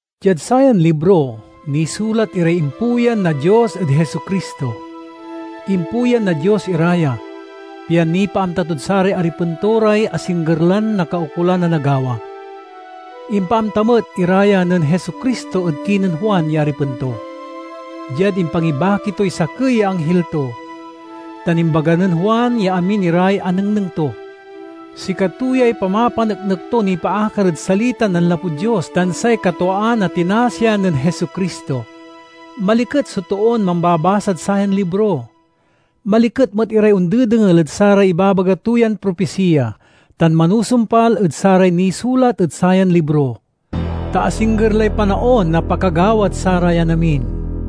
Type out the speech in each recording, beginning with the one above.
Diad sayan libro nisulat iray impuyan na Dios ed Jesu-Cristo. Impuyan na Dios ira ya, pian nipaamta tod saray aripen to ray asingger lan nakaukolan a nagawa. Impaamta met ira ya nen Jesu-Cristo ed kinen Juan ya aripen to, diad impangibaki toy sakey ya anghil to, tan imbaga nen Juan ya amin iray anengneng to. Sikato yay pamapaneknek to nipaakar ed salitan nanlapud Dios tan say katwaan a tinasian nen Jesu-Cristo. Maliket so toon mambabasad sayan libro. Maliket met iray ondedengel ed saray ibabaga to yan propisiya tan manusumpal ed saray nisulat ed sayan libro! Ta asingger lay panaon na pakagawad sarayan amin.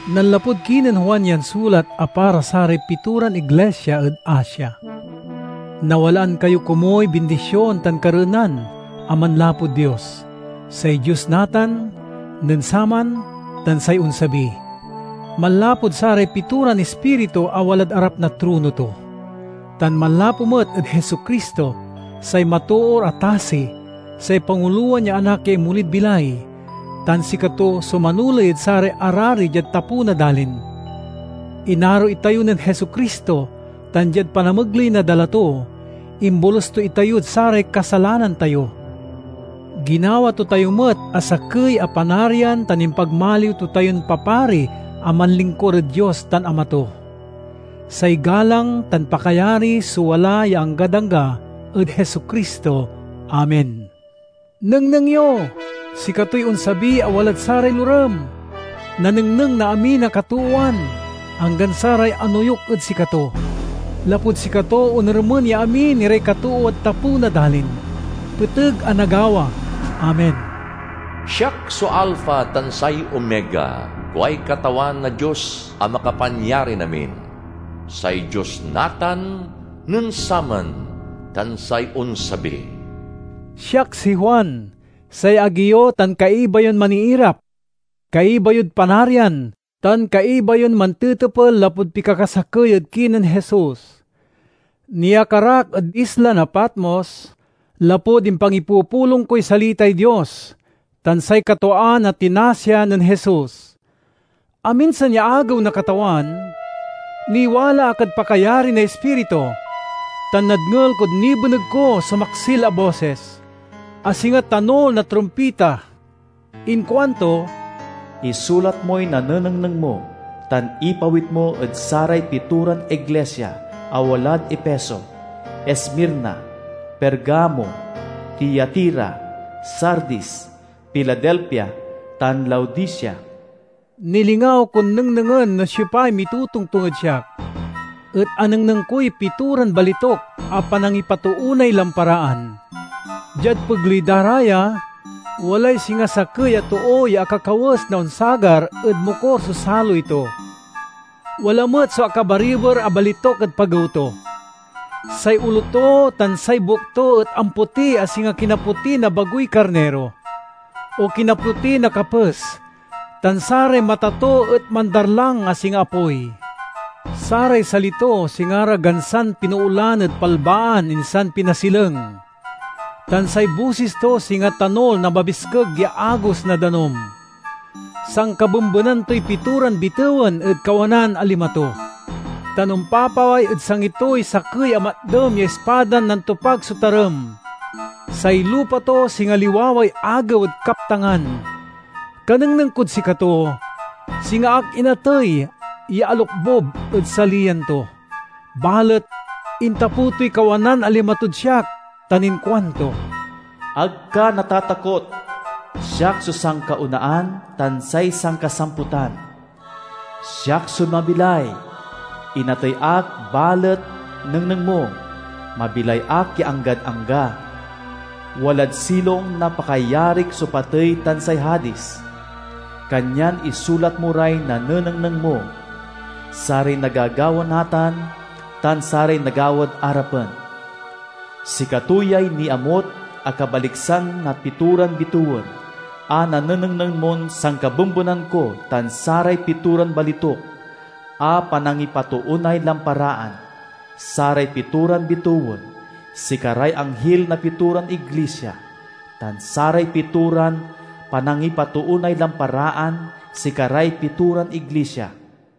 Nanlapud kinen Juan yan sulat a para saray pitoran iglisia ed Asia: Nawalaan kayo komuy bindision tan kareenan a manlapud Dios—say Dios natan, nen saman, tan say onsabi—manlapud saray pitoran ispiritu a walad arap na trono to, tan manlapu met ed Jesu-Cristo, say matoor a tasi, say pangulowan ya Anak ya inmolid bilay, tan sikato so manoley ed saray arari diad tapew na dalin. Inaro itayo nen Jesu-Cristo tan diad panamegley na dala to, imbolus to itayod saray kasalanan tayo. Ginawa to tayo met a sakey a panarian tan impagmaliw to tayon papari a manlingkur ed Dios tan Ama to. Say galang tan pakayari so wala ya anggad angga ed Jesu-Cristo! Amen. Nengneng yo, sikatoy onsabi a walad saray lorem! Nanengneng na amin a katoowan, anggan saray anoyuk ed sikato. Lapud sikato, onermen ya amin iray katoowad tapew na dalin. Peteg a nagawa! Amen. "Siak so Alpha tan say Omega," kuay Katawan a Dios a Makapanyarin-amin, say Dios natan, nen saman, tan say onsabi. Siak si Juan, say agi yo tan kaiba yon maniirap, kaiba yod Panarian, tan kaiba yon mantetepel lapud pikakasakey ed kinen Jesus! Niakar ak ed isla na Patmos, lapud impangipupulong koy salitay Dios tan say katwaan a tinasian nen Jesus. Aminsan ya agew na Katawan, niwala ak ed pakayari na Ispiritu tan nadngel kon nibeneg ko so maksil a bosis, a singa tanul na trumpita. Inkuanto, "Isulat moy nanenengneng mo, tan ipawit mo ed saray pitoran iglisia a walad Efeso, Esmirna, Pergamo, Tiatira, Sardis, Filadelfia, tan Laodicea." Nilingaw kon nengnengen no siopay mitotongtong ed siak, et anengneng koy pitoran balituk a panangipatoonay lamparaan. Diad pegley da ra ya, walay singa sakey a too ya akakawes na onsagar ed mokur so saloy to. Wala met so akabariber a balituk ed pagew to. Say olo to tan say buek to et ampoti a singa kinapoti na bagoy karniro, o kinapoti na kapes, tan saray mata to et mandarlang a singa apoy. Saray sali to singa ra gansan pinoolan ed palbaan insan pinasileng, tan say bosis to singa tanul na mabiskeg ya agos na danum. Sankabembenan toy pitoran bitewen ed kawanan a lima to, tan ompapaway ed sangi toy sakey a matdem ya ispadan nantopag so tarem. Say lupa to singa liwaway agew ed kaptangan. Kanengneng kod sikato, singa ak inatey ya alokbub ed saliyan to. Balet intapew toy kawanan a lima tod siak tan inkuanto: "Ag ka natatakot! Siak so sankaonaan tan say sankasamputan. Siak so mabilay! Inatey ak balet, nengneng mo, mabilay ak ya anggad angga. Walad silong na pakayarik so patey tan say Hadis. Kanyan isulat mo ray nanenengneng mo: saray nagagawa natan tan saray nagawad arapen. Sikato yay niamut a kabaliksan na pitoran bitewen a nanenengneng mon sankabembenan ko tan saray pitoran balituk a panangipatoonay lamparaan: saray pitoran bitewen sikaray anghil na pitoran iglisia, tan saray pitoran panangipatoonay lamparaan sikaray pitoran iglisia.